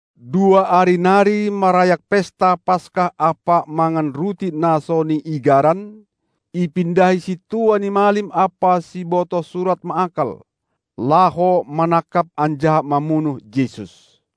Dua ari nari marayak pesta Paska ampa mangan ruti na so niigaran, ipindahi sintua ni malim ampa sibotoh surat ma akal, laho manangkap anjaha mamunuh Jesus.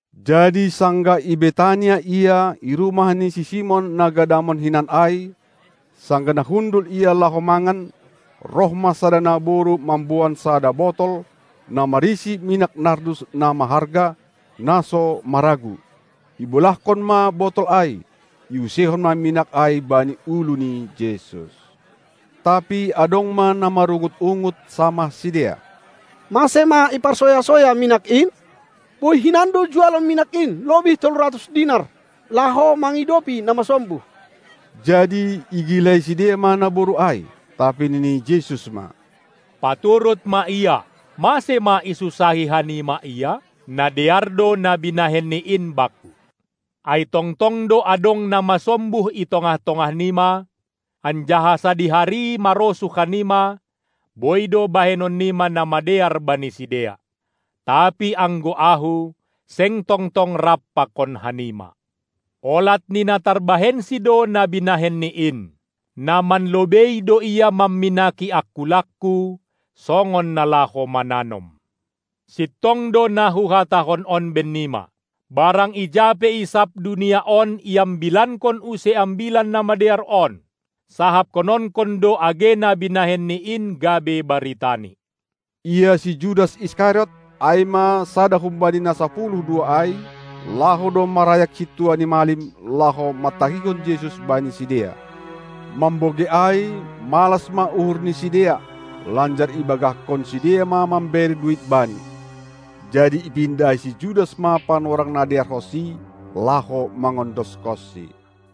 Jadi sanggah i Betania Ia, i rumah ni si Simon na gadamon hinan ai, sanggah na hundul Ia laho mangan, roh ma sada naboru mamboan sada botol, na marisi minak nardus na maharga, na so maragu. Ibolahkon ma botol ai, iuseihon ma minak ai bani ulu ni Jesus. Tapi adong ma na marungut-ungut samah sidea: Mase ma iparsoya-soya minak in? Boi hinan do jualon minak in lobih tolu ratus dinar, laho mangidopi na masombuh. Jadi igilai sidea ma naboru ai. Tapi nini Jesus ma: Paturut ma ia. Mase ma isunsahi hanima ia? Na dear do na binahenni in Bakku! Ai tongtong do adong na masombuh i tongah-tongah nima, anjaha sadihari marosuh hanima, boi do bahenon nima na madear bani sidea; tapi anggo Ahu seng tongtong rap pakon hanima. Olat ni na tarbahensi do na binahenni in; na manlobei do ia mamminaki angkulangKu songon na laho mananom. Sintong do na Huhatahon on bennima: Barang ija pe i sab dunia on iambilankon use Ambilan Namadear on, sahapkononkon do age na binahenni in gabe baritani. Ia si Judas Iskariot, ai ma sada humbani na sapuluh dua ai, laho do marayak sintua ni malim, laho mantahihon Jesus bani sidea. Mambogei ai, malas ma uhur ni sidea, lanjar ibagahkon sidea ma mambere duit bani. Jadi ipindahi si Judas ma panorang na dearhonsi, laho mangondoskonSi.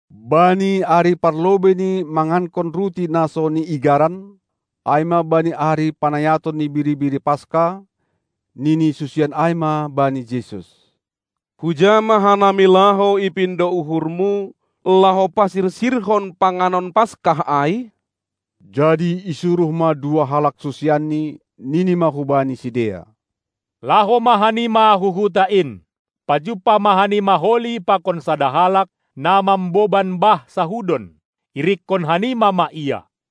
Bani ari parlobei ni mangankon ruti na so niigaran, ai ma bani ari panayaton ni biri-biri Paska, nini susian ai ma bani Jesus: Huja ma hanami laho ipindo uhurMu, laho pasirsirhon panganon Paska ai? Jadi isuruh ma dua halak susianNi, nini ma hubani sidea: Laho ma hanima hu huta in, pajumpah ma hanima holi pakon sada halak, na mamboban bah sahudon. Irikkon hanima ma ia!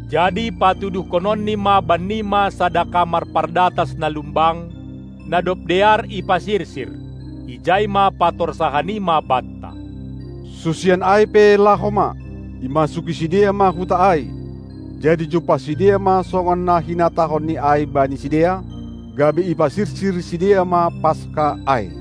Jadi patuduhkononni ma bannima sada kamar pardatas na lumbang, na dob dear ipasirsir. Ijai ma patorsa hanima banta! Susian ai pe laho ma, imasuki sidea ma huta ai, jadi jumpah sidea ma songon na hinatahonni ai bani sidea, gabe ipasirsir sidea ma Paska ai.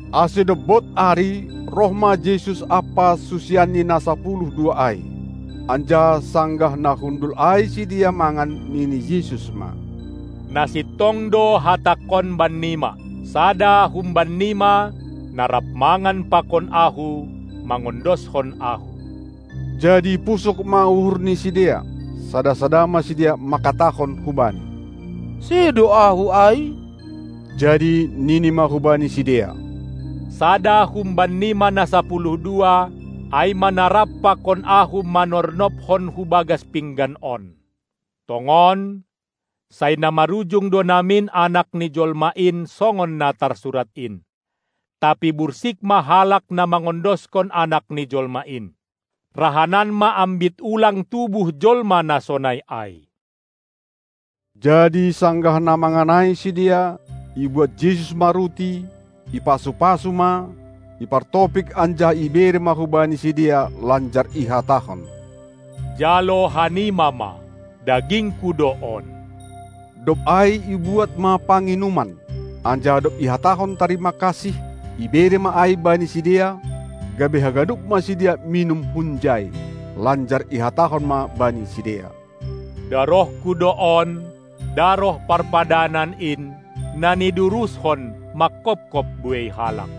Ase dob bod ari, roh ma Jesus ampa susianNi na sapuluh dua ai. Anjaha sanggah na hundul ai sidea mangan, nini Jesus ma: Na sintong do hatangkon bannima, sada humban nima, na rap mangan pakon Ahu, mangondoskon Ahu. Jadi pusok ma uhur ni sidea, sada-sada ma sidea mangkatahon hu Bani: Sedo ahu ai? Jadi nini ma hubani sidea: Sada humbanima na sapuluh dua, ai ma na rap pakon Ahu manornobkon hubagas pinggan on. Tongon, sai na marujung do namin Anak ni jolma in songon na tarsurat in, tapi bursik ma halak na mangondoskon Anak ni jolma in. Rahanan ma ambit ulang tubuh jolma na sonai ai! Jadi sanggah na mangan ai sidea, ibuat Jesus ma ruti, ipasu-pasu ma, ipartopik anjaha ibere ma hubani sidea, lanjar ihatahon: Jalo hanima ma, dagingKu do on! Dob ai ibuat ma panginuman, anjaha dob ihatahon tarima kasih, ibere ma ai bani sidea, gabe haganup ma sidea minum hunjai. Lanjar ihatahon ma bani sidea: DarohKu do on, daroh parpadanan in, na niduruskon mangkopkop buei halak.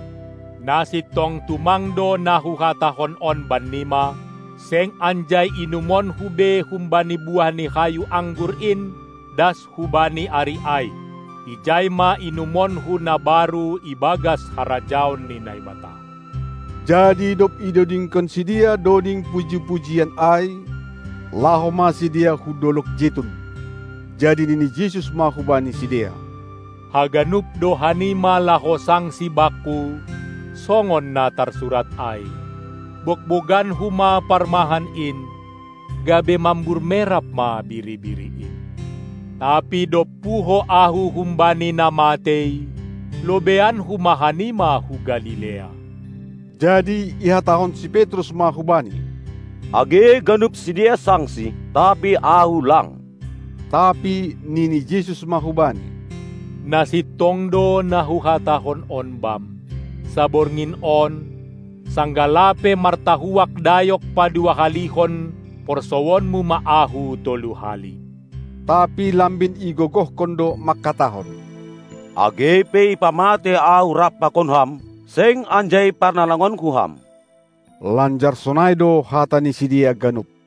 Na sintong tumang do na Huhatahon on bannima: Seng anjai inumonKu be humbani buah ni hayu anggur in das hubani ari ai; ijai ma inumonKu na baru i bagas harajaon ni Naibata. Jadi dob idodingkon sidea doding puji-pujian ai, laho ma sidea hu dolog Jetun. Jadi nini Jesus ma hubani sidea: Haganup do hanima laho sangsi Bakku songon na tarsurat ai: BogboganKu ma parmahan in, gabe mambur merap ma biri-biri in. Tapi dob puho Ahu humbani na matei lobeianKu ma hanima hu Galilea. Jadi ihatahon si Petrus ma hu Bani: Age ganup sidea sangsi, tapi ahu lang. Tapi nini Jesus ma hubani: Na sintong do na Huhatahon on bam: Saborngin on, sanggah lape martahuak dayok padua halihon porsouonmu ma Ahu tolu hali. Tapi lambin igogohkon do mangkatahon: Age pe ipamatei ahu rap pakon Ham, seng anjai parnalangonku Ham. Lanjar sonai do hata ni sidea ganup.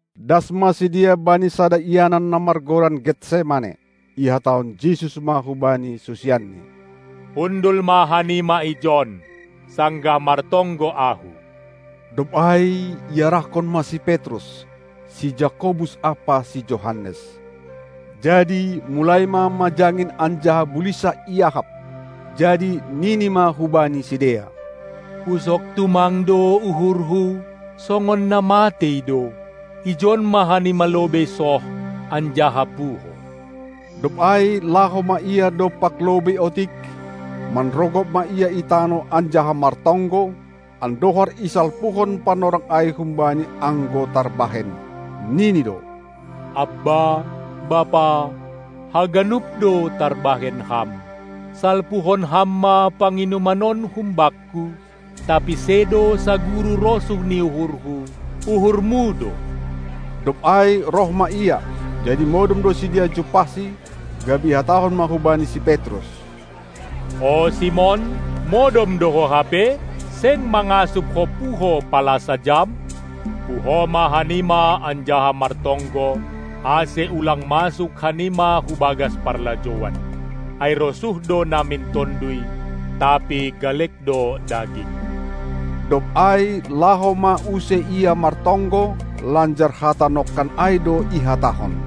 Das ma sidea bani sada ianan na margoran Getsemane. Ihatahon Jesus ma hubani susianNi: Hundul ma hanima ijon, sanggah martonggo Ahu. Dob ai iarahkon ma si Petrus, si Jakobus ampa si Johannes. Jadi mulai ma majangin anjaha bulinsah iahap. Jadi nini ma hubani sidea: Pusok tumang do uhurHu, songon na matei do. Ijon ma hanima lobei soh anjaha puho! Dob ai laho ma Ia dompak lobei otik, manrogop ma Ia i tanoh anjaha martonggo, andohar isalpuhon panorang ai humbani anggo tarbahen. Nini do: Abba, Bapa, haganup do tarbahen Ham! Salpuhon Ham ma panginuman on hum Bakku, tapi sedo saguru rosuh ni uhurHu, uhurMu do! Dob ai roh ma Ia, jadi modom do sidea jumpahSi, gabe ihatahon ma hubani si Petrus: O Simon modom do ho hape? Seng mangasup ho puho pala sajam? Puho ma hanima anjaha martonggo, ase ulang masuk hanima hu bagas parlajouan. Ai rosuh do namin tonduy, tapi galek do daging. Dob ai laho ma use Ia martonggo, lanjar hata nongkan ai do ihatahon.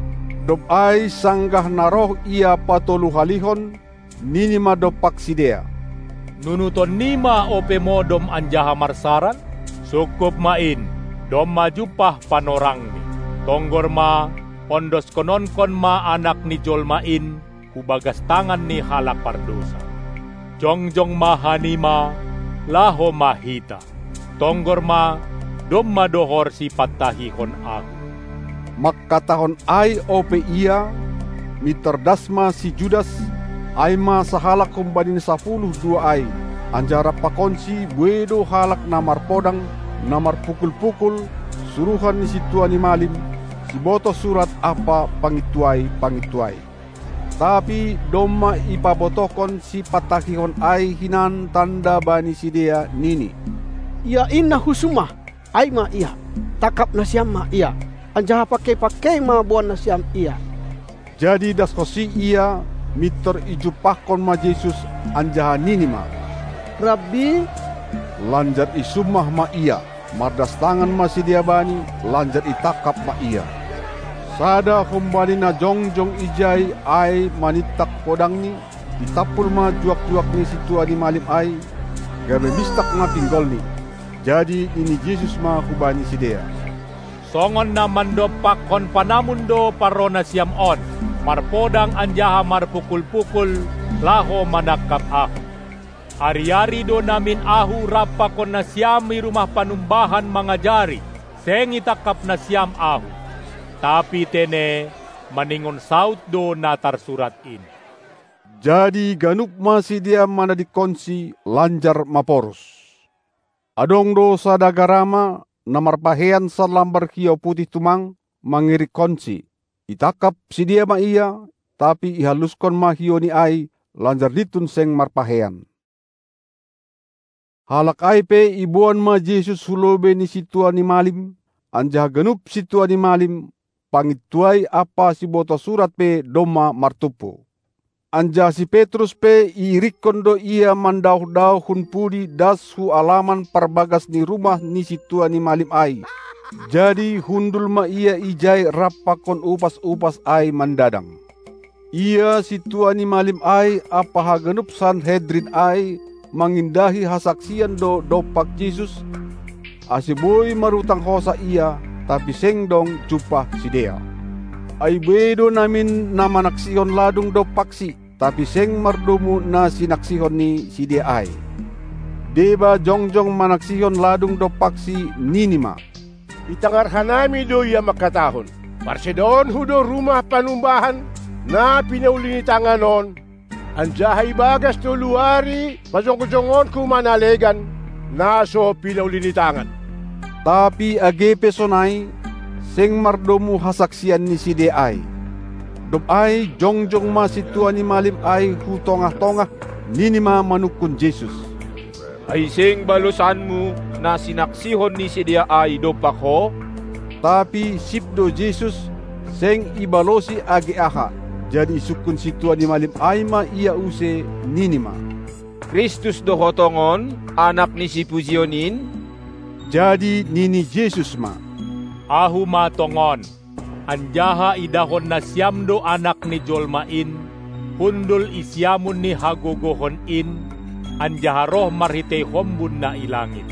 Dob ai sanggah na roh Ia patolu halihon, nini ma dompak sidea: Nunutan nima ope modom anjaha marsaran? Sungkup ma in! Domma jumpah panorangni! Tonggor ma, ondoskononkon ma Anak ni Jolma in hu bagas tangan ni halak pardousa. Jongjong ma hanima, laho ma hita! Tonggor ma, domma dohor sipantahihon Ahu! Mangkatahon ai ope Ia, mintor das ma si Judas, ai ma sahalak humbani na sapuluh dua ai; anjaha rap pakonsi buei do halak na marpodang, na marpukul-pukul, suruhan ni sintua ni malim, sibotoh surat ampa pangintuai-pangintuai. Tapi domma ipabotohkon sipantahihon ai hinan tanda bani sidea, nini: Ia in na husummah, ai ma Ia. Tangkap nasiam ma Ia, anjaha pangkei-pangkei ma boan nasiam Ia! Jadi daskonsi ia, mintor ijumpahkon ma Jesus, anjaha nini ma: Rabbi! Lanjar isummah ma Ia. Mardas tangan ma sidea Bani, lanjar itangkap ma Ia. Sada humbani na jongjong ijai ai manintak podangni, itampul ma juak-juak ni sintua ni malim ai, gabe mistak ma pinggolni. Jadi nini Jesus ma hubani sidea: Songon na mandompakkon panamun do parroh nasiam on, marpodang anjaha marpukul-pukul, laho manangkap Ahu. Ari-ari do namin Ahu rap pakon nasiam i rumah panumbahan mangajari, seng itangkap nasiam Ahu! Tapi tene maningon saud do na tarsurat in. Jadi ganup ma sidea manadingkonSi, lanjar maporus. Adong do sada garama, na marpakeian sanlambar hiou putih tumang, mangirikkonSi. Itangkap sidea ma ia, tapi ihallushon ma hiouni ai, lanjar lintun seng marpakeian. Halak ai pe iboan ma Jesus hu lobei ni sintua ni malim; anjaha ganup sintua ni malim, pangintuai ampa sibotoh surat pe domma martumpu. Anjaha si Petrus pe iirikkon do Ia mandaoh-daoh hun pudi das hu alaman parbagas ni rumah ni sintua ni malim ai; jadi hundul ma ia ijai rap pakon upas-upas ai mandadang. Ia sintua ni malim ai ampa haganup Sanhedrin ai mangindahi hasaksian do dompak Jesus, ase boi marutang hosah Ia, tapi seng dong jumpah sidea. Ai buei namin na manaksihon ladung dompakSi, tapi seng mardomu na sinaksihon ni sidea ai. Deba jongjong manaksihon ladung dompakSi, nini ma: Itangar hanami do Ia mangkatahon: ParsedaonKu do rumah panumbahan, na pinauli ni tangan on, anjaha i bagas tolu ari pajongjongonKu ma na legan, na so pinauli ni tangan. Tapi age pe sonai, seng mardomu hasaksian ni sidea ai. Dob ai jongjong ma sintua ni malim ai hu tongah-tongah, nini ma manungkun Jesus: Ai seng balosanMu na sinaksihon ni sidea ai dompak Ho? Tapi sip do Jesus, seng ibalosi age aha. Jadi isungkun sintua ni malim ai ma Ia use, nini ma: Kristus do Ho tongon, Anak ni Sipujion in? Jadi nini Jesus ma: Ahu ma tongon! Anjaha idahon nasiam do Anak ni Jolma in hundul i siamun ni Hagogohon in, anjaha roh marhitei hombun na i langit.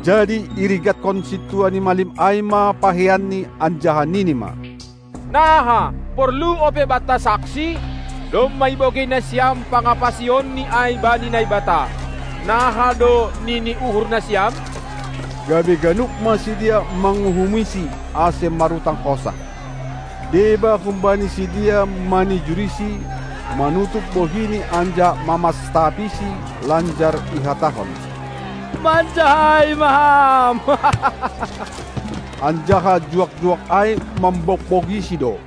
Jadi irigatkon sintua ni malim ai ma pakeianNi, anjaha nini ma: Naha, porlu ope banta saksi? Domma ibogei nasiam pangapasionNi ai bani Naibata. Naha do nini uhur nasiam? Gabe ganup ma sidea manguhumiSi, ase marutang hosah. Deba humbani sidea manijuriSi, manutup bohiNi anjaha mamastapisi, lanjar ihatahon: Manjahai ma Ham! Anjaha juak-juak ai mambogbogiSi do.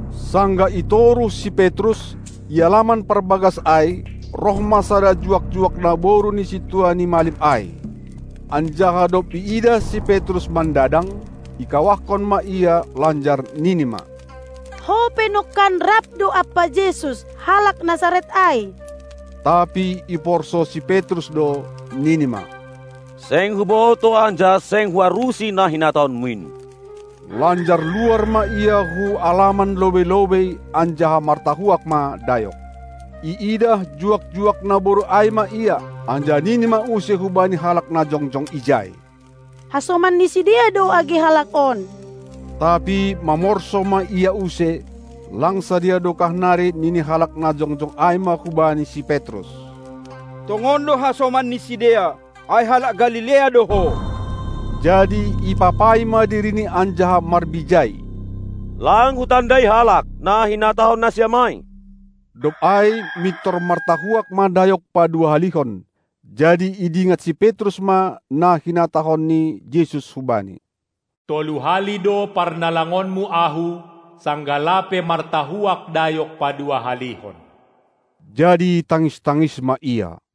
Sanggah i toruh si Petrus, i alaman parbagas ai, roh ma sada juak-juak naboru ni sintua ni malim ai, anjaha dob iidah si Petrus mandadang, ikawahkon ma ia, lanjar nini ma: Ho pe nongkan rap do ampa Jesus, halak Nasaret ai! Tapi iporsou si Petrus do, nini ma: Seng hubotoh anjaha seng huarusi na hinatahonmu in. Lanjar luar ma ia hu alaman lobei-lobei, anjaha martahuak ma dayok. Iidah juak-juak naboru ai ma ia, anjaha nini ma use hubani halak na jongjong ijai: Hasoman ni sidea do age halak on! Tapi mamorsou ma ia use. Lang sadiha dokah nari nini halak na jongjong ai ma hubani si Petrus: Tongon do hasoman ni sidea, ai halak Galilea do ho! Jadi ipapai ma dirini anjaha marbijai: Lang hutandai halak, na hinatahon nasiam ai! Dob ai mintor martahuak ma dayok padua-halihon. Jadi idingat si Petrus ma na hinatahon ni Jesus hubani: Tolu hali do parnalangonmu Ahu, sanggah lape martahuak dayok paduahalihon. Jadi tangis-tangis ma ia.